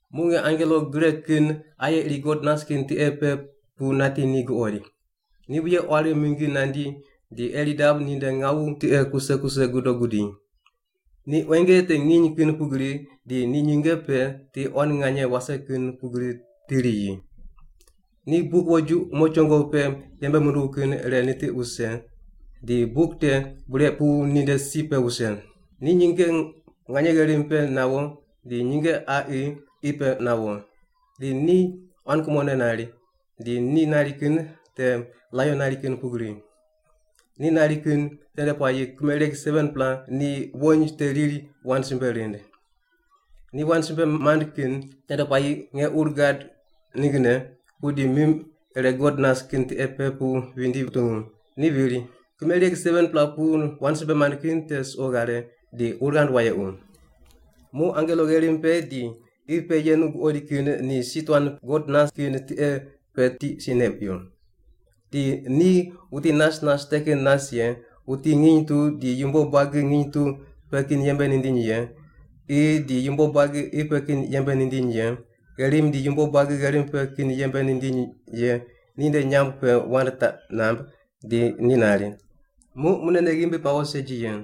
Muq nge angelo gre kin aye iri God nas kin tiqe pe pu nati ni guqoid. Ni wuye quari mingi nandi di eirdab ninde ngawu tiqe kuse kuse gudo gudi. Ni quenge te nginy kin pugri, di ni nyinge pe ti quan nganye wase kin pugri ti riyi. Ni buk woju umo chongo pe yembe munduw kin ire nitiq wuse, di buk te bure pu ninde si pe wuse. Ni nyinge nganye gherim pe nawo di nyinge qaqi qi pe nawo. Di ni quan kumone nari, di ni nari kin te laion nari kin pugri. Ni nari kin tende puayi kimereg 7-pela ni wony te riri wand simbe rind. Ni wand simbe mand kin tende puayi nge ur gad ninggne, pudi mim ire God nas kin tiqe pe pu vindi kutungu, ni viri, “Kimereg 7-pela pu wand simbe mand kin te suqo ghare di ur ghand wayequ.” Muq angelo gherim pe di qi pe yenu guqoid kin ni si tuan God nas kin tiqe pe tiq neq wuyo. Di ni wuti nas nas te kin nas ye, wuti nginy tu di yumbo buagi nginy tu pe kin yembe nindiny ye, qi di yumbo buagi qi pe kin yembe nindiny ye, gherim di yumbo buagi gherim pe kin yembe nindiny ye ninde nyamb pe wand taq namb di ni nari, “Muq munene ghimbi pawo segi ye.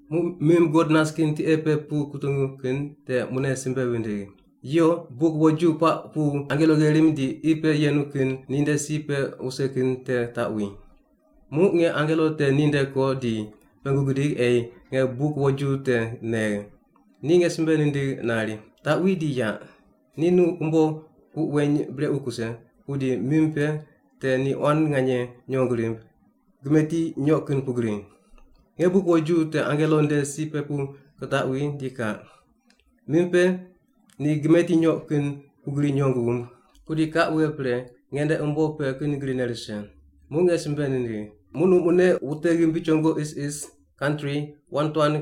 Muq mim God nas kin tiqe pe pu kutungu kin te mune simbe vindigh, “Yo, buk woju puaq pu angelo gherim di qi pe yenu kin ninde si pe wuse kin te taqwi.” Muq nge angelo te ninde ko di pengu gidig ei nge buk woju te negh. Ni nge simbe nindigh nari, “Taqwi di yaq. Ni nu umbo puq weny brequ kuse, pudi mim pe te ni quan nganye nyong rimb, gimeti nyoq kin pugri.” Nge buk woju te angelo nde si pe pu kitaqwi di kaq. Mim pe ni gimeti nyoq kin pugri nyong wumb, pudi kaq wughe pre nge nde umbo pe kin grine rise. Muq nge simbe nindigh, “Muq nu mune wute ghimbi chongo isis, kantri, wand tuan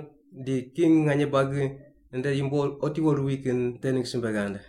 di king nganye buagi nde yumbo otiwo ruwi kin te ningg simbe ghand.”